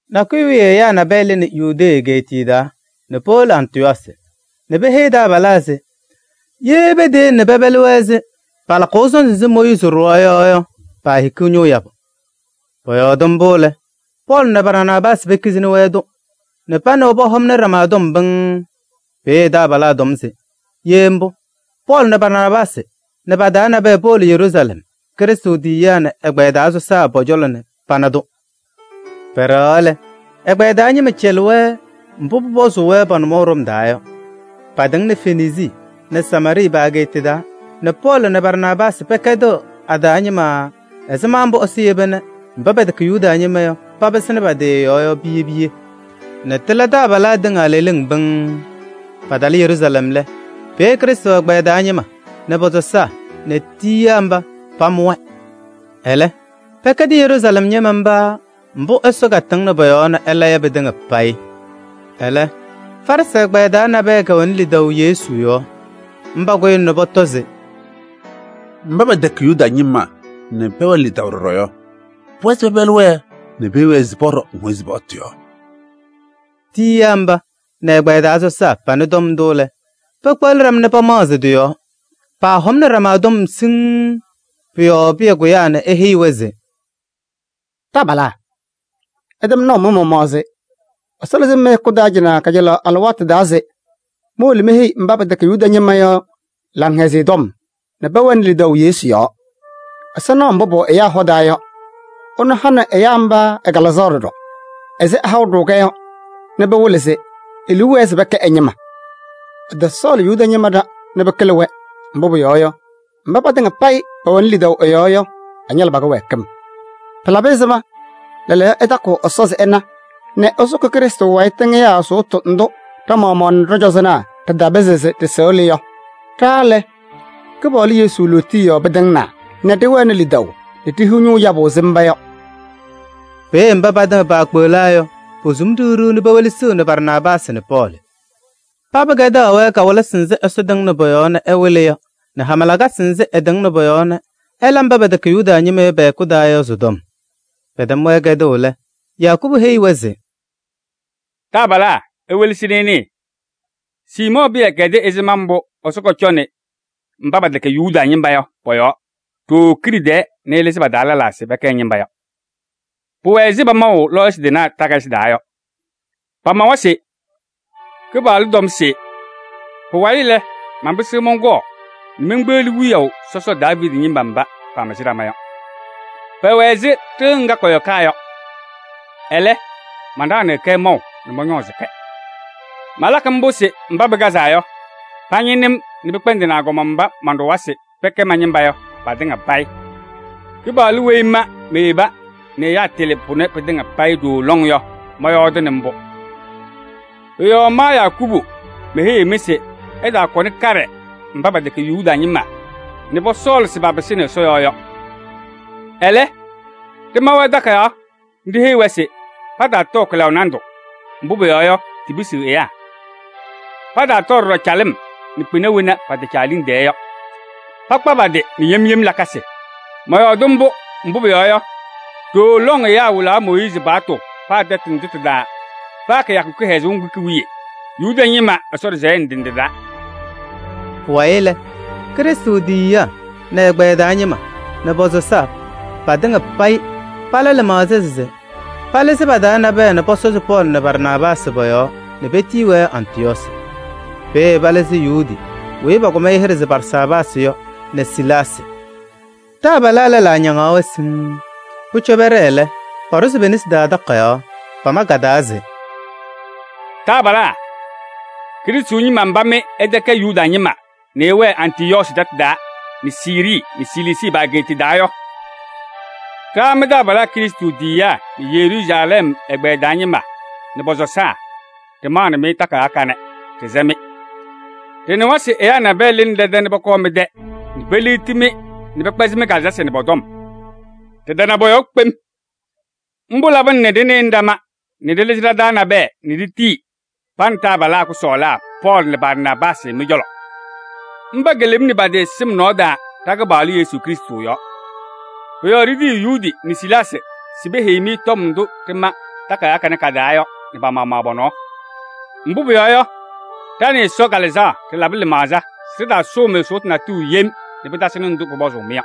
Nakʋyʋ wiye ɛyaa nabɛyɛ lɩnɩ Yudee egeetiye taa nɛ powolo Antɩyɔɔsɩ nɛ peheyiɣ taabalaa se ye peteyele nɛ pɛpɛlɩ-wɛ ɛzɩ palakʋʋ sɔnzɩ nzɩ Mooyiizi ɖʋwa yɔ yɔ, paahikiɣ ñʋʋ yabʋ. Pɔyɔɔdɩ mbʋ lɛ, Pɔɔlɩ nɛ Barnaabaasɩ pekizini-wɛ-tʋ nɛ pa nɛ wɛ pɔhɔmnɩ ɖama tɔm pɩŋŋ. Peeye taabalaa tɔm se: ye mbʋ, Pɔɔlɩ nɛ Barnaabaasɩ nɛ pa-taa nabɛyɛ powolo Yeruusalɛm, Krɩstʋ tiyiyaa nɛ ɛ-ɛgbɛyɛ taa sɔsaa pɔ-cɔlɔ nɛ pana-tʋ. Pɛɖɛɣaɣ lɛ, ɛgbɛyɛ taa ñɩma cɛlɩ-wɛ mbʋ pʋpɔzʋʋ-wɛ pa-nʋmɔʋ ɖɔm taa yɔ. Paatɩŋnɩ Fenisii nɛ Samaarɩɩ pa-ageeta taa nɛ Pɔɔlɩ nɛ Barnaabaasɩ pɛkɛdɩɣ a-taa ñɩma ɛzɩma mbʋ Ɛsɔ yeba nɛ mba pɛtɛkɛ Yuda ñɩma yɔ papɩsɩnɩ ɛ-yɔɔ yɔ piye piye nɛ tɩla taabalaa tɩŋa leleŋ pɩŋŋ. Patalɩ Yeruusalɛm lɛ, peeye Krɩstʋ ɛgbɛyɛ taa ñɩma nɛ pɔ-sɔsaa nɛ tiyiyaa mba pamʋ-wɛ. Ɛlɛ pɛkɛdɩ Yeruusalɛm ñɩma mba mbʋ Ɛsɔ katɩŋnɩ pɔ-yɔɔ nɛ ɛla yɔ pɩtɩŋa payɩ. Ɛlɛ, Farɩsɩ ɛgbɛyɛ taa nabɛyɛ kɛwɛnɩ lidaʋ Yesu yɔɔ. Mba kʋyɩna nɛ pɔtɔ se: “Mba pɛtɛkɛ Yuda ñɩma nɛ pɛwɛnɩ lidaʋ ɖɔɖɔ yɔ, pʋwɛɛ se pɛpɛlɩ-wɛ nɛ peheyi-wɛ se pɔɖɔ Mooyiizi paɣtʋ yɔɔ.” Tiyiyaa mba nɛ ɛgbɛyɛ taa sɔsaa panɩ tɔm ndʋ lɛ, pekpeɣli ɖama nɛ pamaɣzɩ tɩ-yɔɔ. Paahɔmnɩ ɖama tɔm siŋŋ. Pʋ-yɔɔ Pɩyɛ kʋyaa nɛ eheyi-wɛ se: “Taabalaa! Ɩtɛm naʋ mɩ-maɣmaɣ se Ɛsɔ lɩzɩ-m mɩ-hɛkʋ taa cɩnɛ kajalaɣ alɩwaatʋ taa se mowolo meheyi mba pɛtɛkɛ Yuda ñɩma yɔ Laŋhɛzɩyɛ Tɔm nɛ pɛwɛnɩ lidaʋ Yesu yɔɔ. Ɛsɔ naɣ mbʋ pʋwɛ ɛyaa hɔ taa yɔ, ɛnʋ hanɩ ɛyaa mba ɛ-Kalɩzaɣ ɖɔɖɔ ɛzɩ ɛhaʋ-ɖʋ-kɛ yɔ nɛ pɩwɩlɩ se e-liu wɛɛ se pɛkɛ ɛ-ñɩma. Ɛtɔsɔɔlɩ Yuda ñɩma ɖa nɛ pɩkɩlɩ-wɛ, mbʋ pʋyɔɔ yɔ, mba patɩŋa payɩ pɛwɛnɩ lidaʋ ɛ-yɔɔ yɔ, ɛñalɩ pa-kɩwɛɛkɩm. Pɩlabɩ ɛzɩma lɛɛlɛɛyɔ ɩtakɩɣ Ɛsɔ se ɩna nɛ ɩsʋkɩ Krɩstʋ wayɩ tɩŋɩyaa sʋʋtʋ ndʋ ɖa-maɣmaɣ nɛ ɖɔ-cɔzɔnaa ɖɩtapɩzɩ se ɖɩsɩɣlɩ yɔ? Ɖa lɛ, Kɩpaɣlʋ Yesu lootiye yɔɔ pɩtɩŋnaa nɛ ɖɩwɛnɩ lidaʋ nɛ ɖihiɣ ñʋʋ yabʋ ɛzɩ mba yɔ.” Peeye mba patɩŋa paakpeɣlaa yɔ, posum ɖiɣ ɖiɣ nɛ pewelesiɣni Barnaabaasɩ nɛ Pɔɔlɩ. Paba kɛdaɣ-wɛ kawɩlɩsɩ nzɩ Ɛsɔ tɩŋnɩ pɔ-yɔɔ nɛ ɛwɩlɩ yɔ nɛ hama lakasɩ nzɩ ɛtɩŋnɩ pɔ-yɔɔ nɛ ɛla mba pɛtɛkɛ Yuda ñɩma yɔ pɛ-hɛkʋ taa yɔ sɩ-tɔm. Pɛtɛm-wɛ kɛdʋʋ lɛ, Yakubu heyi-wɛ se: “Taabalaa! Iwelesi nɛ ɩnɩɩ. Siimɔɔ Pɩyɛ kɛdɩ ɛzɩma mbʋ Ɛsɔ kɔcɔnɩ mba pɛtɛkɛ Yuda ñɩma yɔ pɔ-yɔɔ ɖooo kiɖe tɛɛ nɛ ɛlɩzɩ pa-taa lɛlaa se pɛkɛ ɛ-ñɩma yɔ. Pʋwɛ ɛzɩ pamaʋ lɔɔyɩsɩ tɩnaa takayɩsɩ taa yɔ. Pamawa se: ‘Kɩpaɣlʋ tɔm se: pʋwayɩ lɛ, manpɩsɩɣ mɔnkɔɔ nɛ menkpeɣli wiyaʋ sɔsɔ Daaviidi ñɩma mba pamɩzɩ ɖama yɔ: pɛwɛ ɛzɩ ɖɩɣa ŋga kɔyɔkaa yɔ. Ɛlɛ, manɖaɣnɩɣ-kɛ maʋ nɛ mɔñɔɔzɩ-kɛ. Malakɩ mbʋ se mba pɩkazaa yɔ, pañɩnɩ-m nɛ pɩkpɛndɩnɩ agɔma mba manɖʋwa se pɛkɛ ma-ñɩma yɔ patɩŋa payɩ. Kɩpaɣlʋ weyi ma meyeba nɛ ɛyaa tɩlɩ pʋnɛ pɩtɩŋa payɩ ɖooo lɔŋ yɔ, mɔyɔɔdɩnɩ mbʋ.’ Pʋ-yɔɔ ma Yakubu meheyiɣ-mɩ se ɩtaakɔnɩ kaɖɛ mba pɛtɛkɛ Yuda ñɩma nɛ pɔsɔɔlɩ se papɩsɩnɩ Ɛsɔ yɔɔ yɔ. Ɛlɛ, ɖɩma-wɛ takayaɣ nɛ ɖiheyi-wɛ se pataatɔɔ kɩlaʋ nandʋ, mbʋ pʋyɔɔ yɔ, tipisiɣ ɛyaa. Pataatɔɔ ɖɔɖɔ calɩm nɛ kpɩna wena pɛtɛcɛ a-liŋ tɛɛ yɔ. Pakpa pa-tɩ nɛ yem yem lakasɩ. Mɔyɔɔdɩ mbʋ, mbʋ pʋyɔɔ yɔ, ɖooo lɔŋ ɛyaa wɩlaɣ Mooyiizi paɣtʋ paa tɛtʋ ndʋ tɩ-taa paa kɩyakʋ kɩhɛzʋʋ ŋgʋ ki-wiye Yuda ñɩma Ɛsɔ ɖɩsɛyɛ ndɩ ndɩ taa.” Pʋwayɩ lɛ, Krɩstʋ tiyiyaa nɛ ɛ-ɛgbɛyɛ taa ñɩma nɛ pɔ-sɔsaa, patɩŋa payɩ pala lɩmaɣza se palɩzɩ pa-taa nabɛyɛ nɛ pɔsɔzɩ Pɔɔlɩ nɛ Barnaabaasɩ pɔ-yɔɔ nɛ petiyi-wɛ Antɩyɔɔsɩ. Peeye palɩzɩ Yuudi weyi pakʋm hɩɖɛ se Barsaabaasɩ yɔ nɛ Silaasɩ. Taabalaa lɛlaa ñaŋaɣ-wɛ siŋŋ. Pʋcɔ pɛɖɛɛ lɛ, paɖʋzɩ pe-nesi taa takayaɣ. Pama ka-taa se: “Taabalaa, Krɩstʋ ñɩma mba mɩ ɩtɛkɛ Yuda ñɩma nɛ ɩwɛɛ Antɩyɔɔsɩ tɛtʋ taa nɛ Siirii nɛ Siliisii pa-ageeta taa yɔ! Ɖa mɩ-taabalaa Krɩstʋ tiyiyaa nɛ Yeruusalɛm ɛgbɛyɛ taa ñɩma nɛ pɔ-sɔsaa ɖɩmaɣnɩ-mɩ takayaɣ kanɛ, ɖɩsɛ-mɩ! Ɖɩnɩwa se ɛyaa nabɛyɛ lɩnɩ ɖɛ-tɛ nɛ pɔkɔɔ mɩ-tɛ nɛ peliɣti-mɩ nɛ pɛkpɛzɩ mɩ-kalɩzasɩ nɛ pɔ-tɔm. Ɖɩtana pɔ-yɔɔ kpem. Mbʋ labɩna nɛ ɖɩnɩnɩ ɖama nɛ ɖɩlɩzɩ ɖa-taa nabɛyɛ nɛ ɖitiyi pa nɛ taabalaa kʋsɔɔlaa Pɔɔlɩ nɛ Barnaabaasɩ mɩ-cɔlɔ. Mba kelemni pa-tɩ sɩm nɔɔ taa ɖa-Kɩpaɣlʋ Yesu Krɩstʋ yɔɔ. Pʋ-yɔɔ ɖitiyiɣ Yuudi nɛ Silaasɩ se peheyi-mɩ tɔm ndʋ ɖɩma takayaɣ kanɛ ka-taa yɔ nɛ pa-maɣmaɣ pɔ-nɔɔ. Mbʋ pʋyɔɔ yɔ, ɖa nɛ Ɛsɔ Kalɩzaɣ ɖɩlabɩ lɩmaɣza se ɖɩtaasʋʋ-mɩ sʋʋtʋ natʋyʋ yem nɛ pɩtasɩnɩ ndʋ pʋpɔzʋʋ-mɩ yɔ.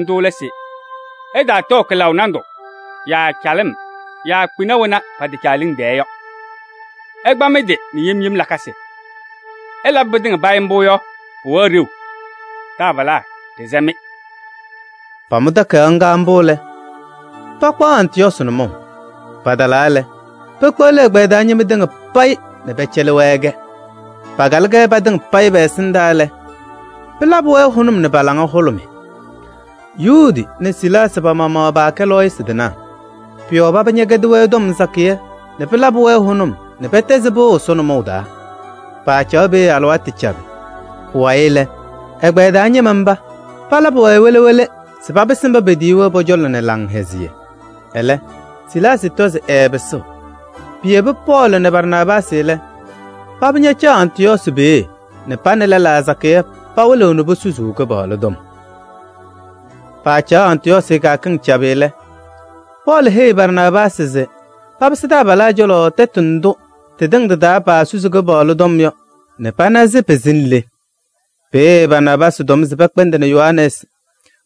Ndʋ lɛ se: ɩtaatɔɔ kɩlaʋ nandʋ yaa calɩm yaa kpɩna wena pɛtɛcɛ a-liŋ tɛɛ yɔ. Ɩkpa mɩ-tɩ nɛ yem yem lakasɩ. Ɩlabɩ pɩtɩŋa payɩ mbʋ yɔ, pʋwɛɣ ɖeu. Taabalaa, ɖɩsɛ-mɩ!” Pamʋ takayaɣ ŋga mbʋ lɛ, pakpaɣ Antɩyɔɔsɩ nʋmɔʋ. Patalaa lɛ, pekpeɣli ɛgbɛyɛ taa ñɩma tɩŋa payɩ nɛ pɛcɛlɩ-wɛ-kɛ. Pakalɩ-kɛ patɩŋa pɛ-ɛsɩndaa lɛ, pɩlabɩ-wɛ hʋnʋm nɛ pa-laŋa hʋlʋmɩ. Yuudi nɛ Silaasɩ pa-maɣmaɣ paakɛ lɔɔyɩsɩ tɩnaa. Pʋ-yɔɔ paba ñɛkɛdɩ-wɛ tɔm sakɩyɛ se pɩlabɩ-wɛ hʋnʋm nɛ pɛtɛzɩ pɩʋ Ɛsɔ nʋmɔʋ taa. Paacaɣ peeye alɩwaatʋ cabɩ. Pʋwayɩ lɛ, ɛgbɛyɛ taa ñɩma mba palabɩ-wɛ wele wele se papɩsɩ mba paatiyi-wɛ yɔ pɔ-cɔlɔ nɛ laŋhɛzɩyɛ. [ Ɛlɛ, Silaasɩ tɔ se ɛɛpɩsɩɣ.] Piyebi Pɔɔlɩ nɛ Barnaabaasɩ lɛ, paba ñacaɣ Antɩyɔɔsɩ peeye nɛ pa nɛ lɛlaa sakɩyɛ pawɩlɩɣ nɛ posusuu Kɩpaɣlʋ tɔm. Pacaɣ Antɩyɔɔsɩ kɩyakɩŋ cabɩ lɛ, Pɔɔlɩ heyi Barnaabaasɩ se papɩsɩ taabalaa cɔlɔ tɛtʋ ndʋ tɩtɩŋa tɩ-taa paasusi Kɩpaɣlʋ tɔm yɔ nɛ pana se pɩsɩnɩ le. Peeye Barnaabaasɩ tɔm se pɛkpɛndɩnɩ Yohanɛɛsɩ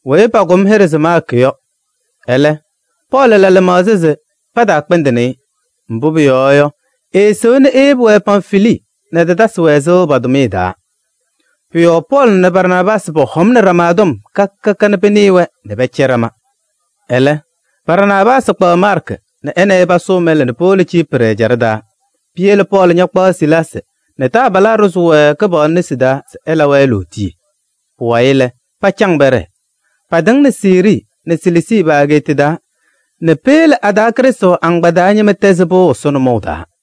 weyi pakʋm hɩɖɛ se Maarkɩ yɔ. Ɛlɛ, Pɔɔlɩ la lɩmaɣza se pataakpɛndɩnɩ-ɩ. Mbʋ pʋyɔɔ yɔ, eesewa nɛ eyebi-wɛ Pamfilii nɛ ɛtatasɩ-wɛ sɩʋ pa-tʋmɩyɛ taa. Pʋ-yɔɔ Pɔɔlɩ nɛ Barnaabaasɩ pɔhɔmnɩ ɖama tɔm ka ka nɛ pɩnɩɩ-wɛ nɛ pɛcɛ ɖama. Ɛlɛ, Barnaabaasɩ kpaɣ Maarkɩ nɛ ɛ nɛ ɩ pasʋʋ mɛlɛ nɛ powolo Ciiprɩ ɛjaɖɛ taa. Piyele Pɔɔlɩ ñakpaɣ Silaasɩ nɛ taabalaa ɖʋzɩ-wɛ Kɩpaɣlʋ nesi taa se ɛlabɩ-wɛ lootiye. Pʋwayɩ lɛ, pacaŋ pɛɖɛɛ. Paatɩŋnɩ Siirii nɛ Siliisii pa-ageeta taa nɛ peyele a-taa Krɩstʋ agbaa taa ñɩma tɛzɩ pɩʋ Ɛsɔ nʋmɔʋ taa.